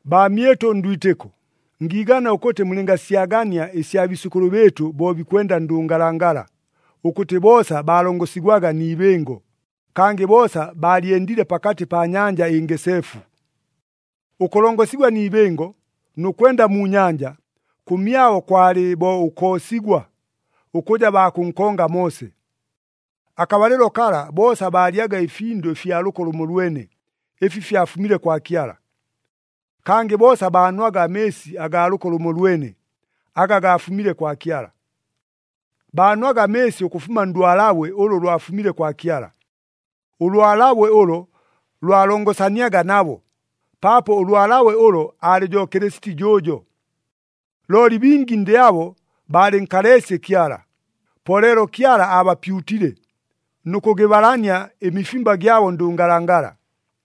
Baamyɨtʉ ndwitɨko, ngiigana ʉkʉtɨ mulɨngasyagania ɨsya biisʉkʉlʉ bɨɨtʉ bo bikwenda ndʉngalangala, ʉkʉtɨ boosa baalongosigwaga ni ibɨngo, kangɨ boosa baalyendile pakatɨ pa Nyanja ɨNgeseefu. Ʉkʉlongosigwa ni ibɨngo, nʉ kwenda mu nyanja, kʉmyabo kwalɨ bo ʉkoosigwa, ʉkʉja baa kʉnkonga Moose. Akabalɨlo kala, boosa baalyaga ɨfindʉ ɨfya lʉko lʉmolwene, ɨfi fyafumile kwa Kyala. Kangɨ boosa baanwaga amɨɨsi agaa lʉko lʉmolwene, aga gaafumile kwa Kyala. Baanwaga amɨɨsi ʉkʉfuma ndwalabwe ʉlʉ lwafumile kwa Kyala. Ʉlwalabwe ʉlo lwalongosaniaga nabo, paapo ʉlwalabwe ʉlo, aalɨ jo Kɨlɨsiti jʉʉjo. Looli bingi ndɨ abo baalɨnkaleesye Kyala, po leelo Kyala aabapyutile, nʉ kʉgɨbalania ɨmifimba gyabo ndʉngalangala.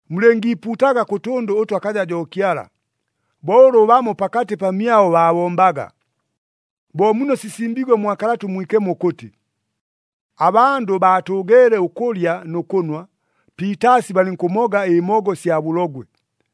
Mulɨngiipuutaga kʉ tʉndʉ ʉtʉ akaja jo Kyala, bo ʉlʉ bamo pakatɨ pamyabo baabombaga. Bo muno sisimbiigwe mwa Kalata ʉMwikemo ʉkʉtɨ, “Abandʉ baatʉʉgeele ʉkʉlya nʉ kʉnwa, piitaasi balɨnkʉmoga ɨmogo sya bʉlogwe.”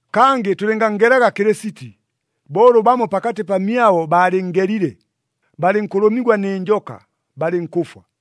Kangɨ tʉlɨnganngelaga Kɨlɨsiti, bo ʉlʉ bamo pakatɨ pamyabo baalɨnngelile, balɨnkʉlʉmigwa nɨ njoka, balɨnkʉfwa.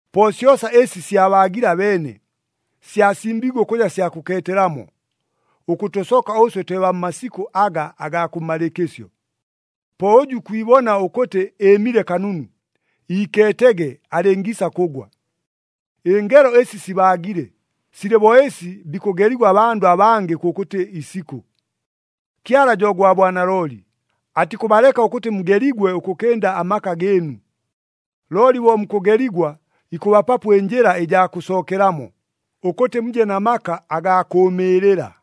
Po syosa ɨsi syabaagile abeene, syasimbiigwe ʉkʉja sya kʉkeetelamo, ʉkʉtʉsoka ʉswe twe baa mmasikʉ aga agaa kʉmmalɨɨkɨsyo. Po ʉjʉ ikwibona ʉkʉtɨ ɨɨmile kanunu, iikeetege alɨngiisa kʉgwa! Ɨngelo ɨsi sibaagile, silɨ bo ɨsi bikʉgeligwa abandʉ abangɨ kʉkʉtɨ isikʉ. Kyala jo gwa bwanalooli, atikʉbaleka ʉkʉtɨ mugeligwe ʉkʉkɨnda amaka gɨɨnu. Looli bo mukʉgeligwa, ikʉbapapo ɨnjɨla ɨjaa kʉsookelamo, ʉkʉtɨ muje na maka agaa kʉʉmɨɨlɨla.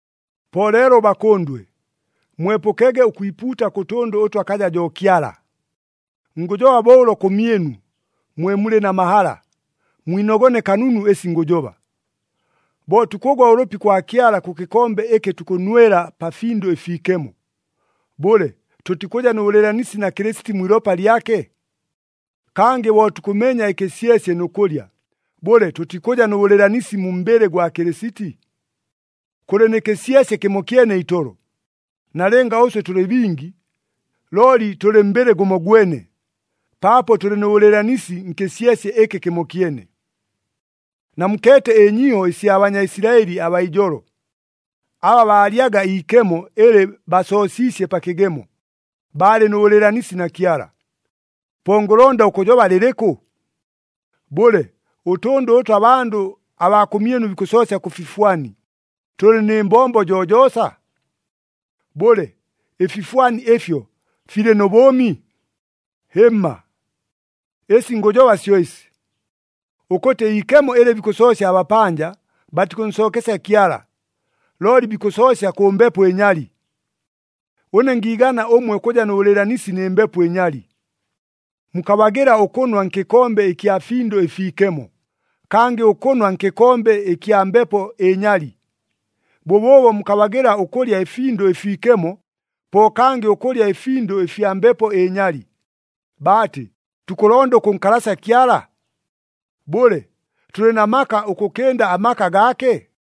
Po leelo bakʉndwe, mwepʉkege ʉkwipuuta kʉ tʉndʉ ʉtʉ akaja jo Kyala! Ngʉjoba bo ʉlo kʉmyɨnu, mwe mulɨ na mahala, mwinogone kanunu ɨsi ngʉjoba. Bo tukʉgwa ʉlʉpi kwa Kyala kʉ kɨkombe ɨkɨ tukʉnwela pa Findʉ ɨFiikemo, bʉle tʉtikʉja nʉ bʉlɨɨlanisi na Kɨlɨsiti mwi ilopa lyake? Kangɨ bo tukʉmenya ɨkɨsyesye nʉ kʉlya, bʉle tʉtikʉja nʉ bʉlɨɨlanisi mu mbɨlɨ gwa Kɨlɨsiti? Kʉlɨ nɨ kɨsyesye kɨmokyene itolo. Nalɨnga ʉswe tʉlɨ bingi, looli tʉlɨ mbɨlɨ gʉmogwene, paapo tʉlɨ nʉ bʉlɨɨlanisi nkɨsyesye ɨkɨ kɨmokyene. Namukeete ɨnyiiho ɨsya Banyaisilaɨli abaa ijolo. Aba baalyaga iikemo ɨlɨ basoosiisye pa kɨgemo, baalɨ nʉ bʉlɨɨlanisi na Kyala. Po ngʉlonda ʉkʉjoba lɨlɨkʉ? Bʉle, ʉtʉndʉ ʉtʉ abandʉ abaa kʉmyɨnu bikʉsoosya kʉ fifwani, tʉlɨ nɨ mbombo jojoosa? Bʉle, ɨfifwani ɨfyo filɨ nʉ bʉʉmi? Hɨmma! Ɨsi ngʉjoba syo ɨsi, ʉkʉtɨ iikemo ɨlɨ bikʉsoosya abapanja, batikʉnsookesya Kyala, looli bikʉsoosya kʉ mbepo ɨnyali. Ʉne ngiigana ʉmwe ʉkʉja nʉ bʉlɨɨlanisi nɨ mbepo ɨnyali. Mukabagɨla ʉkʉnwa nkɨkombe ɨkya Findʉ ɨFiikemo, kangɨ ʉkʉnwa nkɨkombe ɨkya mbepo ɨnyali. Bʉbʉʉbo mukabagɨla ʉkʉlya ɨFindʉ ɨFiikemo, po kangɨ ʉkʉlya ɨfindʉ ɨfya mbepo ɨnyali. Baatɨ, tukʉlonda ʉkʉnkalasya Kyala? Bʉle, tʉlɨ na maka ʉkʉkɨnda amaka gaake?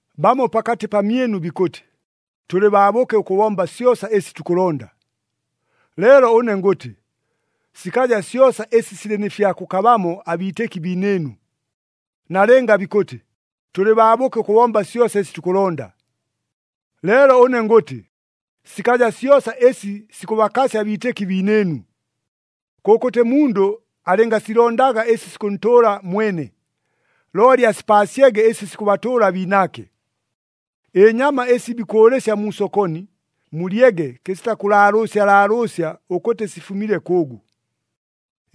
Bamo pakatɨ pamyɨnu bikʉtɨ, “Tʉlɨ baabʉke ʉkʉbomba syosa ɨsi tukʉlonda,” leelo ʉne ngʉtɨ, sikaja syosa ɨsi silɨ nɨ fya kʉkabamo abiitɨki biinɨɨnu. Nalɨnga bikʉtɨ, “Tʉlɨ baabʉke ʉkʉbomba syosa ɨsi tukʉlonda,” leelo ʉne ngʉtɨ, sikaja syosa ɨsi sikʉbakasya abiitɨki biinɨɨnu. Kʉkʉtɨ mundʉ alɨngasilondaga ɨsi sikʉntʉʉla mwene, looli asipaasyege ɨsi sikʉbatʉʉla abiinaake. Ɨnyama ɨsi bikʉʉlɨsya mu sokoni, mulyege kɨsita kʉlaalʉʉsya laalʉʉsya ʉkʉtɨ sifumile kʉʉgʉ.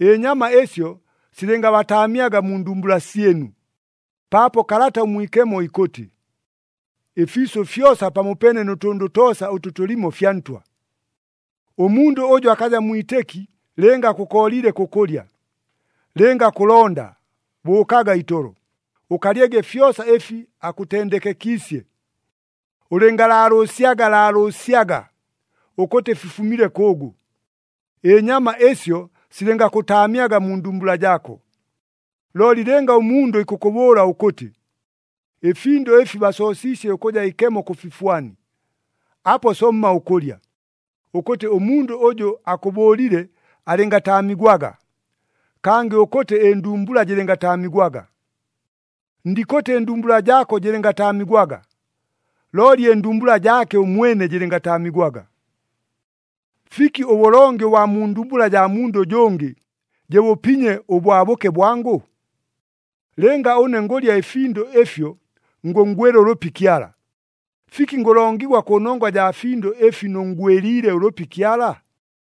Ɨnyama ɨsyo silɨngabataamyaga mu ndumbula syɨnu, paapo Kalata ʉMwikemo ikʉtɨ, “Ɨfiisʉ fyosa pamopeene nʉ tʉndʉ toosa ʉtʉ tʉlimo fya Ntwa.” Ʉmundʉ ʉjʉ akaja mwitɨki lɨnga akʉkooliile kʉkʉlya, lɨnga kʉlonda, bʉʉkaga itolo, ʉkalyege fyosa ɨfi akʉtendekekiisye. Ʉlɨngalaalʉʉsyaga laalʉʉsyaga ʉkʉtɨ fifumile kʉʉgʉ. Ɨnyama ɨsyo silɨngakʉtaamyaga mu ndumbula jaako. Looli lɨnga ʉmundʉ ikʉkʉbʉʉla ʉkʉtɨ, “Ɨfindʉ ɨfi basoosiisye ʉkʉja ikemo kʉ fifwani,” apo somma ʉkʉlya, ʉkʉtɨ ʉmundʉ ʉjʉ akʉbʉʉlile alɨngataamigwaga, kangɨ ʉkʉtɨ ɨndumbula jɨlɨngataamigwaga. Ndikʉtɨ ɨndumbula jaako jɨlɨngataamigwaga, looli ɨndumbula jaake ʉmwene jɨlɨngataamigwaga. Fiki ʉbʉlongi ʉbwa mu ndumbula jaa mundʉ ʉjʉngɨ, jɨbʉpinye ʉbwabʉke bwangʉ? Lɨnga ʉne ngʉlya ɨfindʉ ɨfyo ngʉnngwɨla ʉlʉpi Kyala, fiki ngʉlongigwa kʉnongwa jaa findʉ ɨfi nʉnngwɨliile ʉlʉpi Kyala?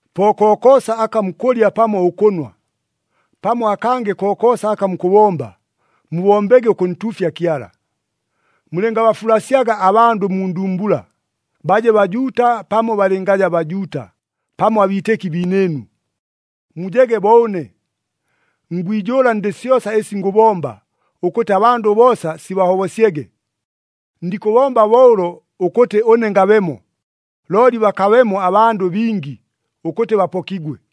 Po kokoosa aka mukʉlya pamo ʉkʉnwa, pamo akangɨ kokoosa aka mukʉbomba, mubombege ʉkʉntuufya Kyala. Mulɨngabafulasyaga abandʉ mu ndumbula, baje Bajuuta, pamo balɨngaja Bajuuta, pamo abiitɨki biinɨɨnu. Mujege bo ʉne. Ngwijʉʉla ndɨ syosa ɨsi ngʉbomba, ʉkʉtɨ abandʉ boosa sibahobosyege. Ndikʉbomba bo ʉlo ʉkʉtɨ ʉne ngabemo, looli bakabemo abandʉ bingi, ʉkʉtɨ bapokigwe.